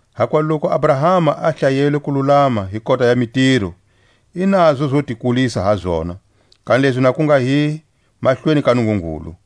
Hakuva loku Abrahama a hlayelwe kululama hi kota ya mitiro, i nazo zo ti kulisa ha zona, kanilezi na ku nga hi mahlweni ka Nungungulu.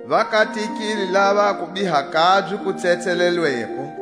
Va katekile lava a kubiha kabye ku tsetselelweko,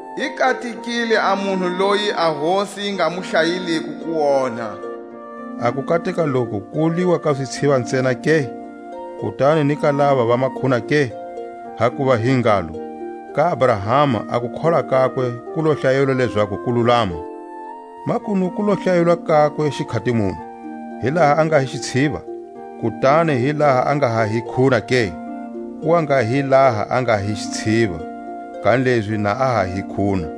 I katekile a munhu loyi a Hosi yi nga mu hlayeliko kuonha. A kukateka loku ku wuliwa ka zitshiva ntsena ke, kutani ni ka lava va makhuna ke? Hakuva hi ngalo: Ka Abrahama a kukholwa kakwe ku lo hlayelwa lezaku kululama. Makunu ku lo hlayelwa kakwe xikhati muni? Hi laha a nga hi xitshiva, kutani hi laha a nga ha hi khuna ke? Ku wa nga hi laha a nga hi xitshiva, kanilezi na a ha hi khuna.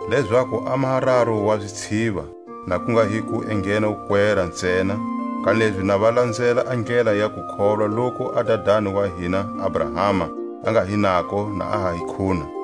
Lezaku a maha raru wa zitshiva, na ku nga hi ku enghena wukwera ntsena, kanilezi na va lanzela a ndlela ya kukholwa loku a dadani wa hina Abrahama a nga hi nako na a ha hi khuna.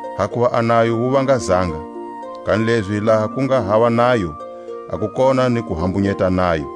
Hakuva a nayo wu vanga zanga, kanilezi laha ku nga hava nayo, a ku kona ni ku hambunyeta nayo.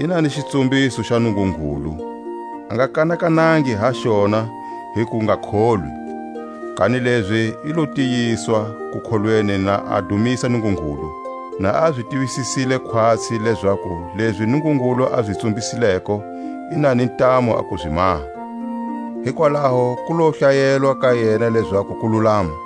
Ina ni xitsumbiso xa Nungungulu, a nga kanakanangi ha xona hi kungakholwi, kanilezi i lo tiyiswa kukholweni na a dumisa Nungungulu. Na a zi tivisisile khwatsi lezaku lezi Nungungulu a zi tsumbisileko i na ni ntamu a ku zi maha. Hikwalaho ku lo hlayelwa ka yena lezaku kululama.